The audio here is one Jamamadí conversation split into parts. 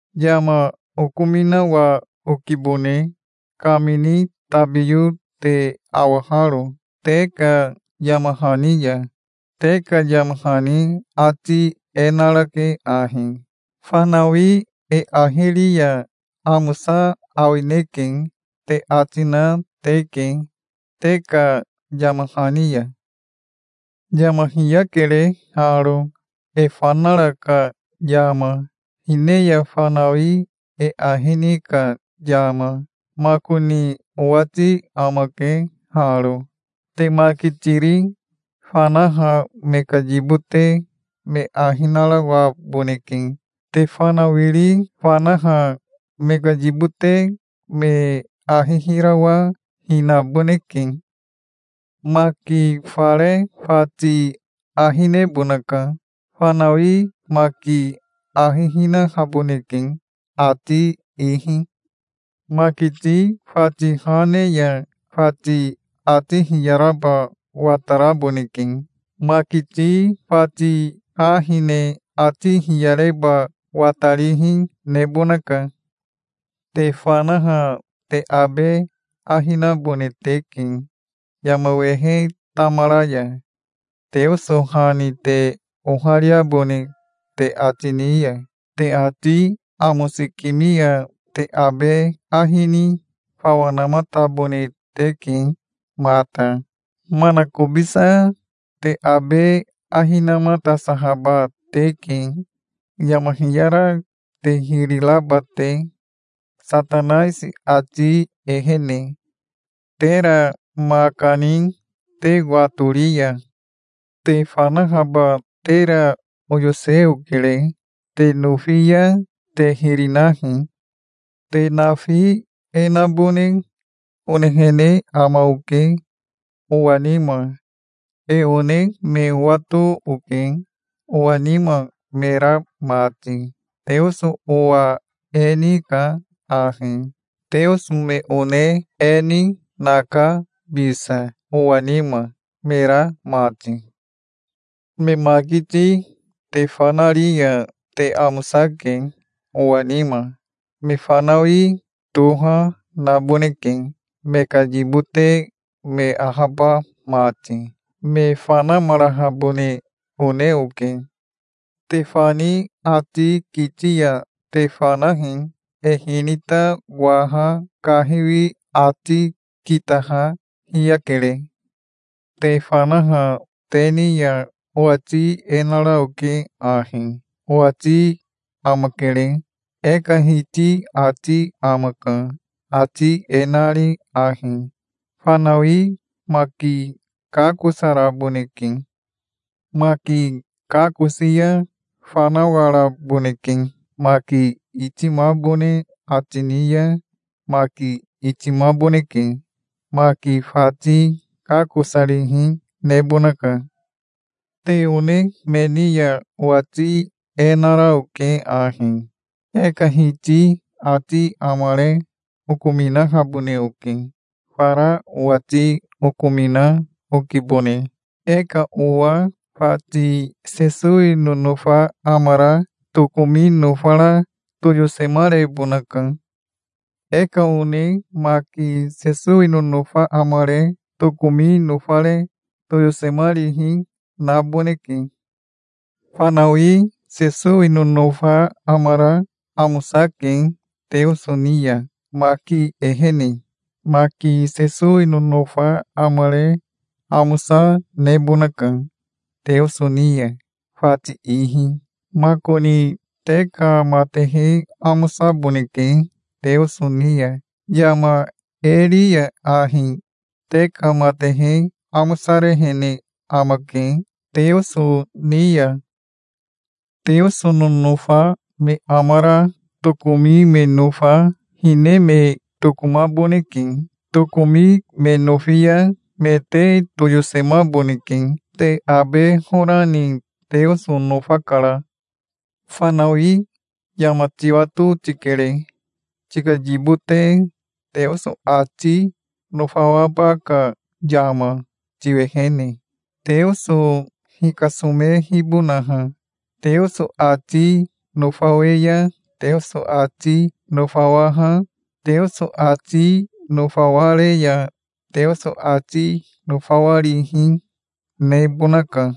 Yama okominawa okibone, kamini tabiyo te awaharo, te ka yama hani ya. Te ka yama hani ati e narake ahi: "Fanawi e ahi ri ya amosa awineke", te ati na teke te ka yama hani ya. Yama hiyakere haro, e fanara ka yama, hine ya fanawi e ahi ni ka yama. Makoni owati amake haro: Te makitiri fanaha me ka yibote me ahi narawaboneke. Te fanawiri fanaha me ka yibote me ahi hirawa hinaboneke. Maki fare fati ahi nebonaka. Fanawi maki ahi hinahaboneke, ati ihi. Makiti fati ha ne ya fati ati hiyaraba wataraboneke. Makiti fati ha hine ati hiyareba watarihi nebonaka. Te fanaha te abe ahi nabone teke. Yama wehe tamara ya Teoso ha ni te ohariabone te ati ni ya te ati amosikimi ya te abe ahi ni fawa namatabone teke mata. Manakobisa te abe ahi namatasahaba teke, yama hiyara te hiri raba te, Satanaisi ati ehene, tera ma kani te watori ya. Te fanahaba tera oyose okere. Te nofi ya te hiri nahi. Te nafi e nabone onehene ama oke, owa nima. E one me owato oke, owa nima me ra mati. Teoso owa e nika ahi. Teoso me one e ni naka bisa, owa nima me ra mati. Me makiti, te fanari ya te amosake, owa nima. Me fanawi toha, naboneke, me ka yibote me ahaba mati. Me fanamarahabone one oke. Te fani ati kiti ya te fanahi. E hinita waha kahiwi ati kitaha hiyakere. Te fanaha te ni ya owati e nara oke ahi: Owati amakere. E ka Hiti ati amaka, ati e nari ahi: Fanawi maki kakosaraboneke. Maki kakosi ya fanawaraboneke. Maki itimabone ati ni ya maki itimaboneke. Maki fati kakosarihi nebonaka. Te one me ni ya owati e nara oke ahi: E ka Hiti ati amare okominahabone oke. Fara owati okomina okibone. E ka owa fati Sesowi nonofa amara tokomi nofara toyosemarebonaka. E ka one maki Sesowi nonofa amare tokomi nofare toyosemarihi naboneke. Fanawi Sesowi nonofa amara amosake Teoso ni ya, maki ehene. Maki Sesowi nonofa amare amosa nebonaka Teoso ni ya, fati ihi. Makoni te ka matehe amosaboneke Teoso ni ya. Yama e ri ya ahi te ka matehe amosarehene amake Teoso ni ya. Teoso nonofa me amara tokomi me nofa hine me tokomaboneke. Tokomi me nofi ya me te toyosemaboneke. Te abe hora ni Teoso nofakara. Fanawi, yama tiwato tikere, tika yibote Teoso ati nofawaba ka yama tiwehene, Teoso hikasomehibonaha. Teoso ati nofawe ya Teoso ati nofawaha, Teoso ati nofaware ya Teoso ati nofawarihi nebonaka.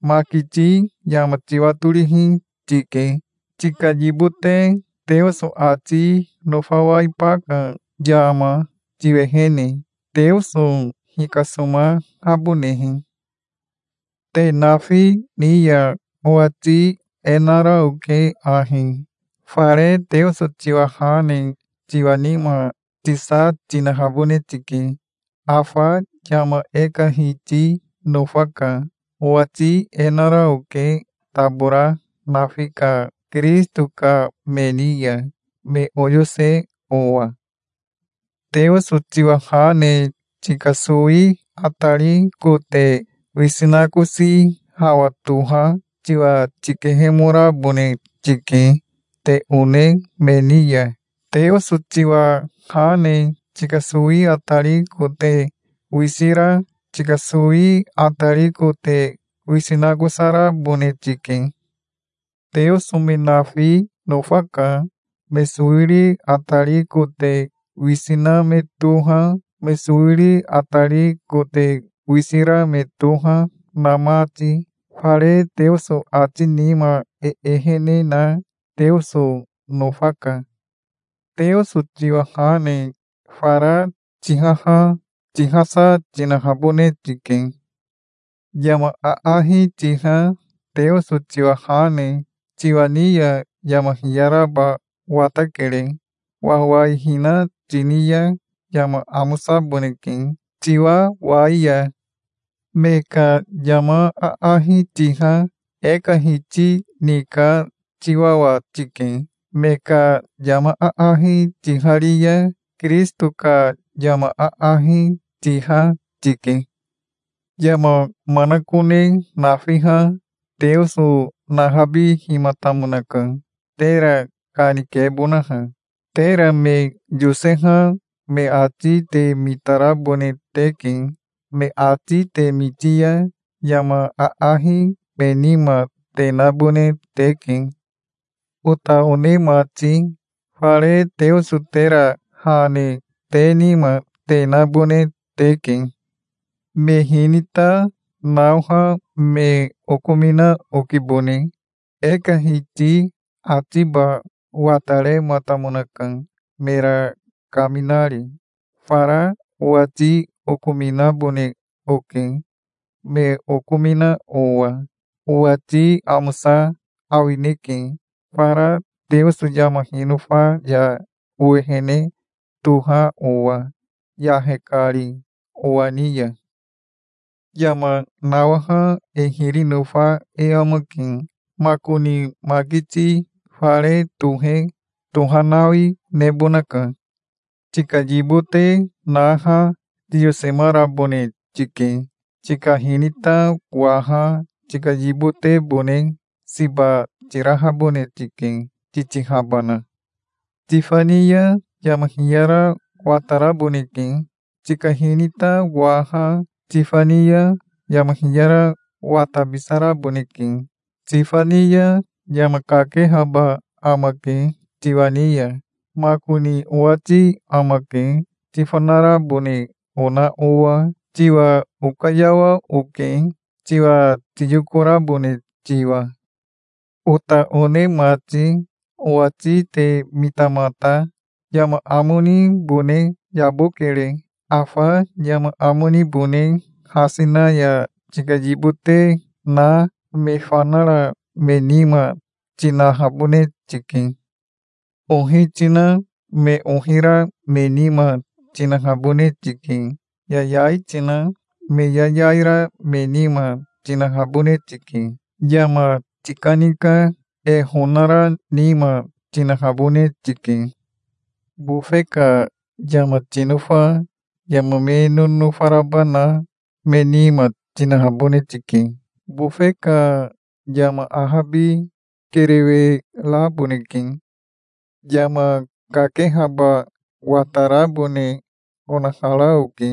Makiti yama tiwatorihi, tike, tika yibote Teoso ati nofawaiba ka yama tiwehene, Teoso hikasomahabonehe. Te nafi ni ya owati e nara oke ahi: Fare Teoso tiwa ha ne tiwa nima tisa tinahabone tike. Afa yama e ka Hiti nofaka. Owati e nara oke tabora nafi ka Kirisito ka me ni ya, me oyose owa. Teoso tiwa ha ne tika sowi atari kote wisi nakosi hawa toha tiwa tikehemorabone tike te one me ni ya. Teoso tiwa ha ne tika sowi atari kote wisi ra tika sowi atari kote wisi nakosarabone tike. Teoso me nafi nofaka, me sowiri atari kote wisi na me toha, me sowiri atari kote wisi ra me toha, na mati. Fare Teoso ati nima e ehene na Teoso nofaka. Teoso tiwa ha ne fara tihaha tihasa tinahabone tike. Yama aahi tiha Teoso tiwa ha ne tiwa ni ya yama hiyaraba watakere. Wawaihina tini ya yama amosaboneke tiwawai ya. Me ka yama aahi tiha e ka Hiti ni ka tiwawa tike. Me ka yama aahi tihari ya Kirisito ka yama aahi tiha tike. Yama manakone nafiha Teoso nahabihimatamonaka, tera kanikebonaha. Tera me yoseha me ati te mitarabone teke. Me ati te miti ya yama aahi me nima te nabone teke. Ota one mati, fare Teoso tera ha ne te nima te nabone teke. Me hinita naoha me okomina okibone. E ka Hiti atiba watarematamonaka, mera kaminari. Fara owati okominabone oke, me okomina owa. Owati amosa awineke, fara Teoso yama hinofa ya owehene toha owa, yahe kari owa ni ya. Yama nawaha e hiri nofa e amake. Makoni makiti fare tohe tohanawi nebonaka. Tika yibote naha tiyosemarabone tike. Tika hinita waha tika yibotebone siba tirahabone tike, titihabana. Tifani ya yama hiyara wataraboneke. Tika hinita waha tifani ya yama hiyara watabisaraboneke. Tifani ya yama kakehaba amake tiwa ni ya. Makoni owati amake, tifanarabone ona owa. Tiwa okayawa oke, tiwa tiyokorabone tiwa. Ota one mati, owati te mitamata. Yama amo nibone yabokere. Afa yama amo nibone hasi na ya tika yibote na, me fanara me nima tinahabone tike. Ohi tina me ohi ra me nima tinahabone tike. Yayai tina me yayai ra me nima tinahabone tike. Yama tikanika, e honara nima tinahabone tike. Bofe ka yama tinofa yama me nonofa raba na me nima tinahabone tike. Bofe ka yama ahabi kerewe raboneke. Yama kakehaba watarabone onahara oke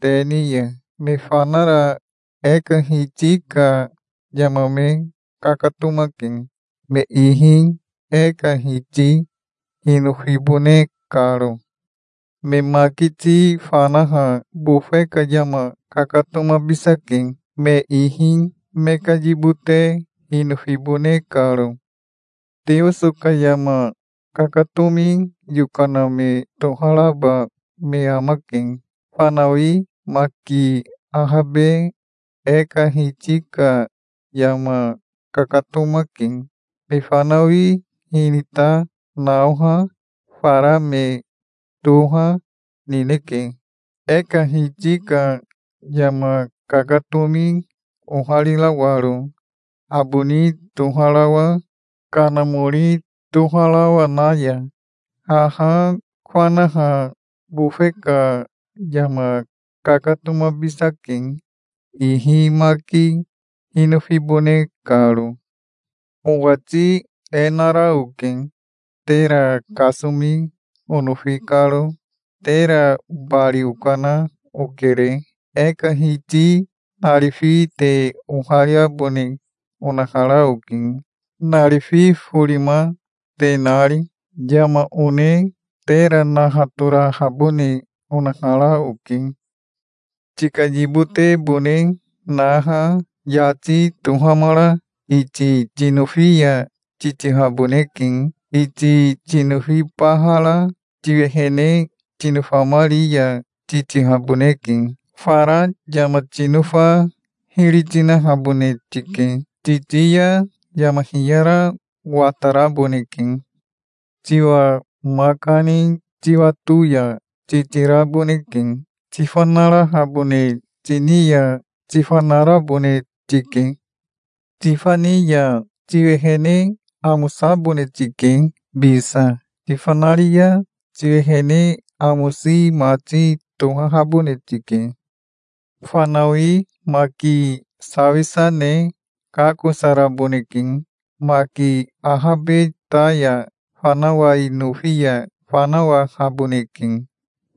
te ni ya. Me fanara e ka Hiti ka yama me kakatomake, me ihi e ka Hiti hinofibone karo. Me makiti fanaha bofe ka yama kakatomabisake, me ihi me ka yibote hinofibone karo. Teoso ka yama kakatomi yokana me toharaba me amake. Fanawi maki ahabe e ka Hiti ka yama kakatomake. Me fanawi hinita naoha fara me toha, nineke, e ka Hiti ka yama kakatomi oharirawaro, aboni toharawa, kanamori toharawa na ya. Haha fanaha bofe ka yama kakatomabisake, ihi maki hinofibone karo. Owati e nara oke, tera kasomi onofi karo. Tera bari okana okere. E ka Hiti narifi te ohariabone onahara oke, narifi forima te nari. Yama one tera nahatorahabone onahara oke. Tika yibotebone naha yati tohamara iti tinofi ya titihaboneke. Iti tinofibahara tiwehene tinofamari ya titihaboneke. Fara yama tinofa hiri tinahabone tike. Titi ya yama hiyara wataraboneke. Tiwa ma kani tiwato ya titiraboneke. Tifanarahabone tini ya tifanarabone tike. Tifani ya tiwehene amosabone tike bisa. Tifanari ya tiwehene amosi mati tohahabone tike. Fanawi maki sawisa ne kakosaraboneke. Maki ahabe ta ya fanawai nofi ya fanawahaboneke.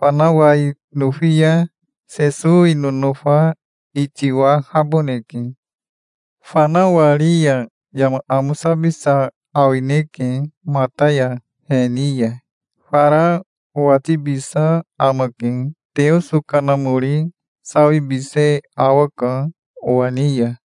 Fanawai nofi ya Sesowi nonofa itiwahaboneke. Fanawari ya yama amosabisa awineke mata ya he ni ya. Fara owatibisa amake. Teoso Kanamori sawibise awaka owa ni ya.